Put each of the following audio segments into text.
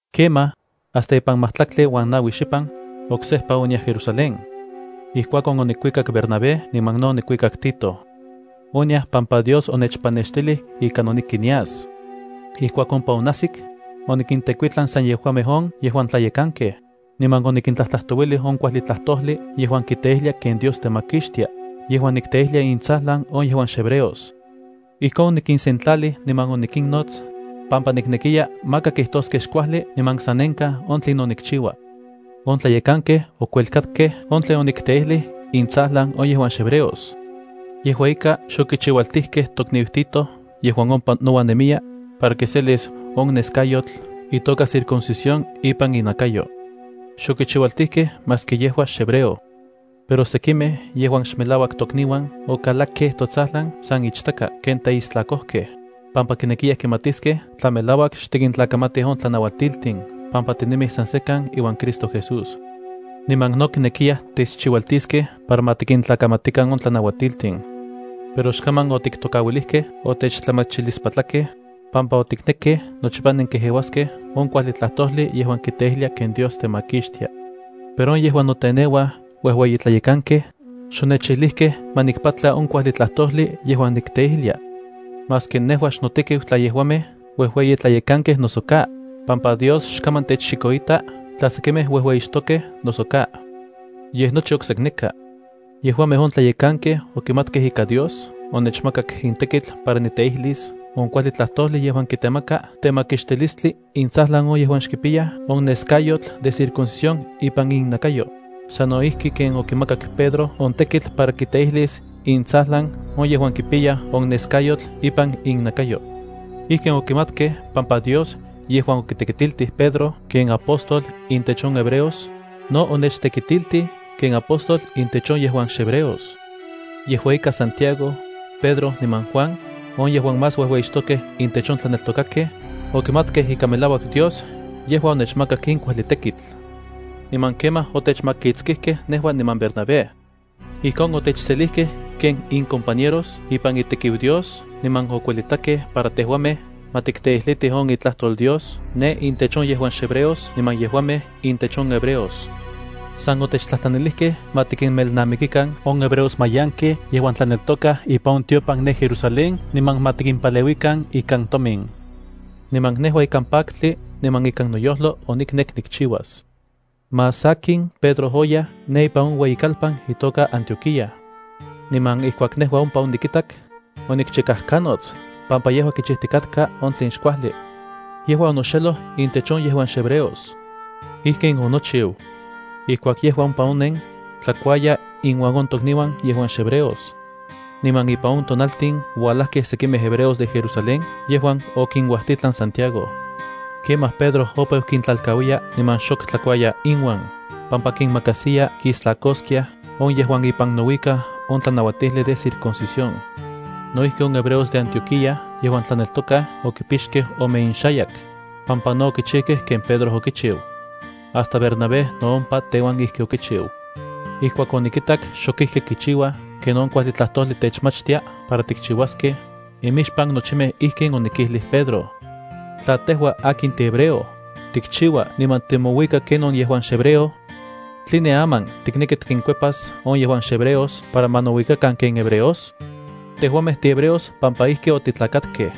Kemaj, hasta ipan majtlaktli uan naui xipan, oksejpa oniaj Jerusalén. Ijkuakon, onikuikak Bernabé, niman no onikuikak Tito. Oniaj pampa Dios onechpanextilij ika noneki nias. Ijkuak ompa onajsik, onikintekuitlan san yejuamej on yejuan tlayekankej, niman onikintlajtlajtouilij on kuajli tlajtojli yejuan kiteijlia ken Dios temakixtia yejuan nikteijlia intsajlan on yejuan xhebreos. Ijkon onikinsentlalij niman onikinnots, pampa niknekiya maka kijtoskej xkuajli niman sanenkaj on tlinon nikchiua. On tlayekankej okuelkakkej on tlen onikteijlij intsajlan on yejuan xhebreos. Yejua ika, xokichiualtijkej tokniu Tito yejuan ompa nouan nemiya, para kiselis on neskayotl itoka circuncisión ipan inakayo. Xokichiualtijkej maski yejua xhebreo. Pero sekimej yejuan xmelauak tokniuan okalakkej totsajlan san ichtaka ken teistlakojkej, pampa kinekiyaj kimatiskej tla melauak xtikintlakamatij on tlanauatiltin pampa tinemij san sekan iuan Cristo Jesús. Niman no kinekiyaj techchiualtiskej para ma tikintlakamatikan on tlanauatiltin. Pero xkaman otiktokauilijkej otechtlamachilispatlakej, pampa otiknekkej nochipa tikejeuaskej on kuajli tlajtojli yejuan kiteijlia ken Dios temakixtia. Pero on yejuan noteneuaj uejueyi tlayekankej, xonechijlijkej ma nikpatla on kuajli tlajtojli yejuan nikteijlia. (Xnotekiu tla yejuamej uejueyi tlayekankej noso ka, pampa Dios xkaman techchikoita tla sekimej uejueyixtokej noso ka.) Yej nochi oksekneka. Yejuamej on tlayekankej okimatkej ika Dios onechmakak in tekitl para nikteijlis on kuajli tlajtojli yejuan kitemaka temakixtilistli intsajlan on yejuan xkipiyaj on neskayotl de circuncisión ipan innakayo, sano ijki ken okimakak Pedro on tekitl para kiteijlis intsajlan on yejuan kipiyaj on neskayotl ipan innakayo. Ijkin okimatkej pampa Dios yejuan okitekitiltij Pedro ken apóstol intech on hebreos, no onechtekitiltij ken apóstol intech on yejuan xhebreos. Yejua ika Santiago, Pedro niman Juan, on yejuan más uejueyixtokej intech on tlaneltokakej, okimatkej ika melauak Dios yejua onechmakak in kuajli tekitl. Niman kemaj otechmakitskijkej nejua niman Bernabé. Ijkon otechselijkej ken incompañeros ipan itekiu Dios, niman okuelitakej para tejuamej ma tikteijlitij on itlajtol Dios ne intech on yejuan xhebreos niman yejuamej intech on hebreos. San otechtlajtlanilijkej ma tikimelnamikikan on hebreos mayankej yejuan tlaneltokaj ipan tiopan ne Jerusalén niman ma tikimpaleuikan ikan tomin. Niman nejua ikan paktli niman ikan noyojlo oniknek nikchiuas. Más sakin Pedro oyaj ne ipan on ueyikalpan itoka Antioquía. Niman ijkuak nejua ompa onikitak, onikchikajkanots, pampa yejua kichijtikatka on tlen xkuajli. Yejua onoxeloj intech on yejuan xhebreos. Ijkin onochiu. Ijkuak yejua ompa onen, tlakuaya inuan on tokniuan yejuan xhebreos. Niman ipan on tonaltin oualajkej sekimej hebreos de Jerusalén yejuan okinuajtitlan Santiago. Kemaj Pedro opeu kintlalkauiya niman xok tlakauya inuan, pampa kinmakajsiya kistlakoskiaj on yejuan ipan nouikaj on tlanauatijli de circuncisión. No ijki on hebreos de Antioquía yejuan tlaneltokaj okipixkej ome inxayak, pampa no okichijkej ken Pedro okichiu. Hasta Bernabé no ompa teuan ijki okichiu. Ijkuak onikitak xok ijki kichiuaj ken on kuajli tlajtojli techmachtia para tikchiuaskej, imixpan nochimej ijkin onikijlij Pedro: “Tla tejua akin tihebreo, tikchiua niman timouika ken on yejuan xhebreo, ¿tline aman tikneki tikinkuepas on yejuan xhebreos para ma nouikakan ken hebreos?” Tejuamej tihebreos pampa ijki otitlakatkej.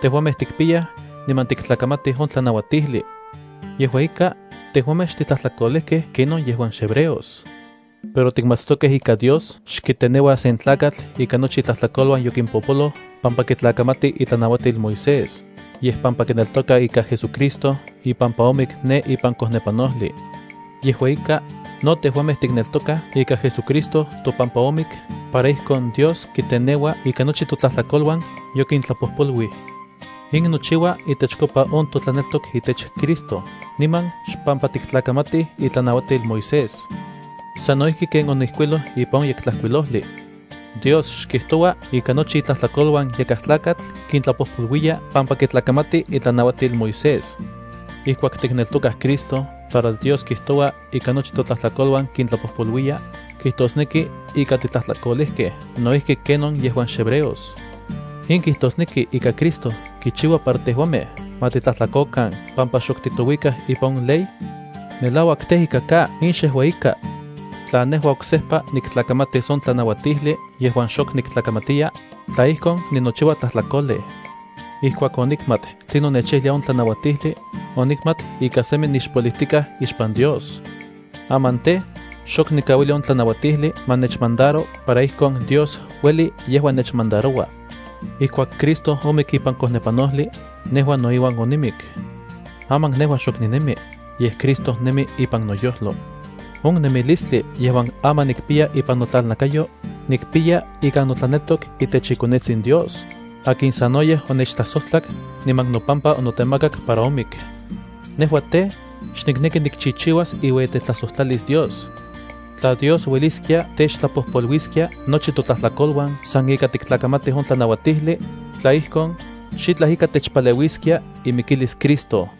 Tejuamej tikpiyaj niman tiktlakamatij on tlanauatijli. Yejua ika, tejuamej xtitlajtlakolejkej kenon yejuan xhebreos. Pero tikmatstokej ika Dios xkiteneua sen tlakatl ika nochi itlajtlakoluan yokimpopoloj pampa kitlakamati itlanauatil Moisés, yej pampa kineltoka ika JesuCristo ipampa omik ne ipan kojnepanojli. Yejua ika, no tejuamej tikneltokaj ika JesuCristo topampa omik para ijkon Dios kiteneua ika nochi totlajtlakoluan yokintlapojpoluij. In nochiua itechkopa on totlaneltok itech Cristo niman xpampa tiktlakamatij itlanauatil Moisés. Sano ijki ken onijkuiloj ipan on Yektlajkuilojli: Dios xkijtoua ika nochi itlajtlakoluan yakaj tlakatl kintlapojpoluiya pampa kitlakamati itlanauatil Moisés. Ijkuak tikneltokaj Cristo para Dios kitojua ika nochi totlajtlakoluan kintlapojpolouiya, kijtosneki ika titlajtlakolejkej no ijki ken on yejuan xhebreos. ¿In kijtosneki ika Cristo kichiua para tejuamej ma titlajtlakokan pampa xok titouikaj ipan on ley? ¡Melauak tej, ika ka! In xejua ika. Tla nejua oksejpa niktlakamatis on tlanauatijli yejuan xok niktlakamatiya, tla ijkon, ninochiua tlajtlakolej. Ijkuak onikmat tlinon nechijlia on tlanauatijli, onikmat ika semi nixpolijtikaj ixpan Dios. Aman tej, xok nikauilia on tlanauatijli ma nechmandaro para ijkon Dios ueli yejua nechmandaroua. Ijkuak Cristo omik ipan kojnepanojli, nejua no iuan onimik. Aman nejua xok ninemi, yej Cristo nemi ipan noyojlo. On nemilistli yejuan aman nikpiya ipan notlalnakayo, nikpiya ikan notlaneltok itech iKonetsin Dios, akin sanoyej onechtlajsojtlak niman nopampa onotemakak para omik. Nejua tej, xnikneki nikchichiuas iueyitetlajsojtlalis Dios. Tla Dios ueliskia techtlapojpoluiliskia nochi totlajtlakoluan san ika tiktlakamatij on tlanauatijli, tla ijkon, xitlaj ika techpaleuiskia imikilis Cristo.